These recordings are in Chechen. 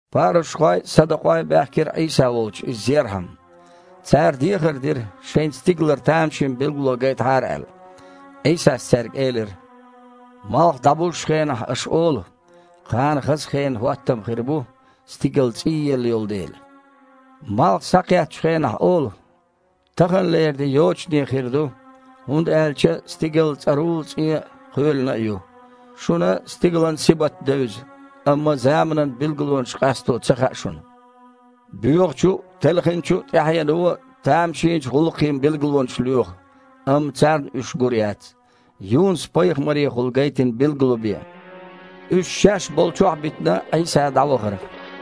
Парушхой а, садукъой а баьхкира Іийса волчу Иза зерхьама. Цара дехар дира, шайна стигалара тамашийна билгало гайтахьара аьлла. Іийсас цаьрга элира: «Малх дІабузучу хенахь аша олу: „Кхана хаза хенан хІоттам хир бу, стигал цІийелла йолу дела“. Малх схьакхеттачу хенахь олу: „Таханлера де йочане хир ду, хІунда аьлча стигал цІарула-цІен а, кхоьлина а ю“. Шуна стигалан сибат девза, амма заманан билгалонаш къасто ца хаьа шуна. Боьхачу а, телхинчу а тІаьхьено тамашийначу гІуллакхийн билгалонаш лоьху, амма царна уьш гур яц, Юнус-пайхамарехула гайтина билгало бен». Уьш шаьш болчохь а битина, Іийса дІавахара.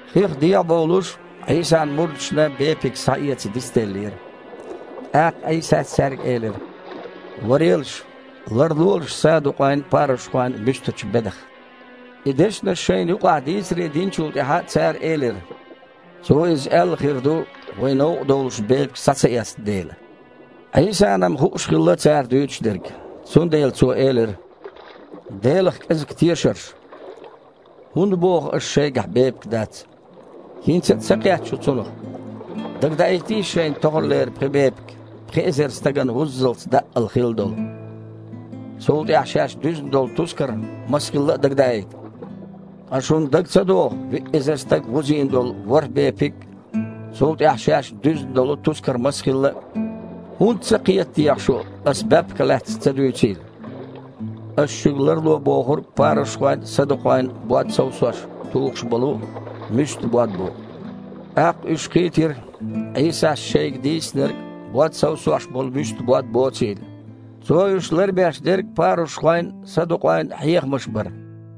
Хих дехьабовлуш, Іийсан мурдашна бепиг схьаэца дицделлера. ТІаккха Іийсас цаьрга элира: «Варелаш, ларлолаш садукъойн а, парушхойн а муьстачу бедах». И дешнаш шайна юкъахь дийцаре динчул тІаьхьа цара элира: «Цо иза аьлла хир ду, вай новкъа довлуш бепиг схьа ца эцна дела». Іийсана-м хууш хилла цара дуьйцуш дерг. Цундела Цо элира: «Делах кІезиг тешарш! ХІунда боху аша шайгахь бепиг дац? ХІинца а ца кхетта шу цунах? Дагадаийтийша шайна тохарлера пхи бепиг, пхи эзар стагана вуззалц даъал хилла долу. Цул тІаьхьа шаьш дуьзна долу тускар маса хилла а дагадаийта. Ткъа шуна дага ца догІу виъ эзар стаг вузийна долу ворхІ бепиг а, цул тІаьхьа шаьш дуьзна долу тускар маса хилла а? ХІунда ца кхета техьа шу Аса баьпках лаьцна ца дуьйцийла? Аса шуьга ларло бохург парушхойн а, садукъойн а бод совсош тухуш болу муьста бод бу». ТІаккха уьш кхийтира Іийсас шайга дийцинарг бод совсош болу муьста бод боцийла. Цо уьш ларбеш дерг парушхойн а, садукъойн а хьехамаш бара.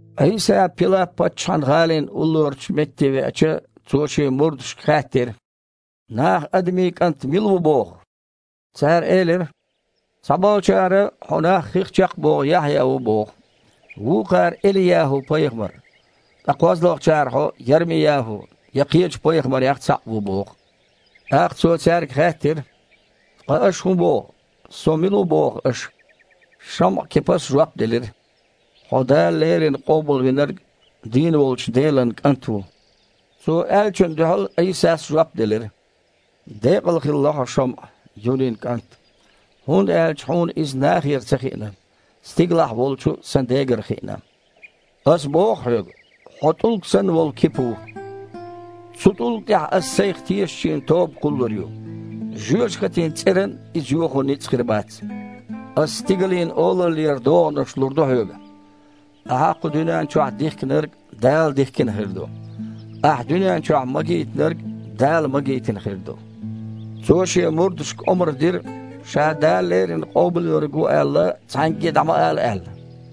Іийса Пилап-паччахьан гІалин уллорачу метте веача, Цо шен мурдашка хаьттира: «Наха Адамийн КІант мила ву боху?» Цара элира: «Цхьаболчара Хьо нах хих чекхбоху Яхьъя ву боху, вукхара Эли-ЯхІу-пайхамар, ткъа кхозлагІчара Хьо Ярми-ЯхІу, я кхечу пайхамарех цхьаъ ву боху». ТІаккха Цо цаьрга хаьттира: «Ткъа аша хІун боху, Со мила ву боху аша?» ШамІа-Кипас жоп делира: «Хьо Дала леррина Къобалвинарг, дийна волчу Делан КІант ву». Цо аьллачунна дуьхьал Іийсас жоп делира: «Декъал хилла хьо, ШамІа, Юнин кІант, хІунда аьлча хьуна иза нахера ца хиъна, стигалахь волчу Сан Дегара хиъна. Аса боху хьоьга: хьо, тІулг санна волу, Кипа ву. Цу тІулга тІехь Аса Сайх тешначийн тоба кхуллур ю. Жоьжахатин цІеран а иза йохо ницкъ хир бац. Аса стигалийн Олаллера догІанаш лур ду хьоьга. Ахьа кху дуьнен чохь дихкинарг Дала дихкина хир ду. Ахьа дуьнен чохь магийтинарг, Дала магийтина хир ду». Цо шен мурдашка омра дира, Ша Дала леррина Къобалвинарг ву аьлла, цхьаьнгге а дІа ма ала аьлла.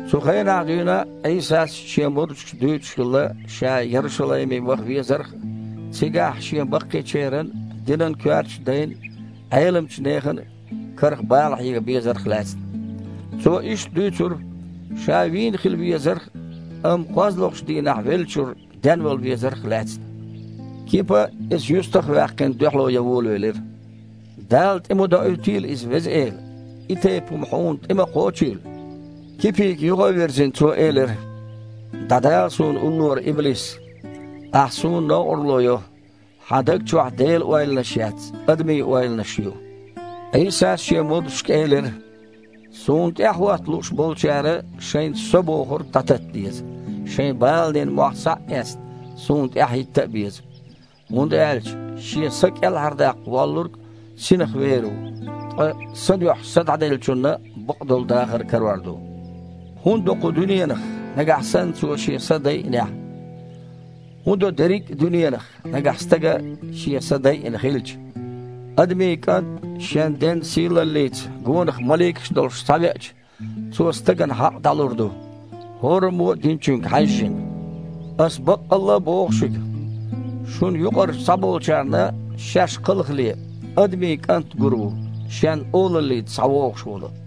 Цу хенахь дуьйна Іийсас Шен мурдашка дуьйцуш хилла Ша Ярушалайме ваха везарх а, цигахь Шен баккхийчеран а, динан коьртачу дайн а, Іеламчу нехан а карах бала хьега безарх а лаьцна. Цо иштта дуьйцура Ша вийна хила везарх а, амма кхозлагІчу дийнахь веллачуьра денвала везарх а лаьцна. Кипа, Иза юьстах а ваьккхина, дуьхьало ян волавелира: «Дала тІе ма доуьйтийла иза, Веза Эла! И тайпа хІума Хьуна тІе ма кхочийла!» Кипига юха а вирзина, Цо элира: «ДІадала Суна уллора, иблис! Ахьа Суна новкъарло йо, хьан даг чохь Делан ойланаш яц, адамийн ойланаш ю». Іийсас Шен мурдашка элира: «Суна тІаьхьахІотта лууш болчара шайн „со“ бохург дІататта деза, шайн баланийн мохь схьа а эцна, Суна тІаьхьахІитта а беза. ХІунда аьлча шен са кІелхьардаккха воьлларг синах вер ву, ткъа Сан дуьхьа са дІаделлачунна бакъдолу дахар карор ду. ХІун до кху дуьненах, нагахь санна цо шен са дайинехь? ХІун до дерриг а дуьненах, нагахь стага шен са дайина хилча? Адамийн КІант шен Ден сийлаллица, гонах маликаш а долуш, схьавеача, Цо стагана хьакъ дІалур ду, хІораммо а динчуьнга хьаьжжина. Аса баккъалла а боху шуьга: шуна юкъарчу цхьаболчарна, шаьш кхалхале, Адамийн КІант гур ву, Шен Олаллица схьавогІуш волу!»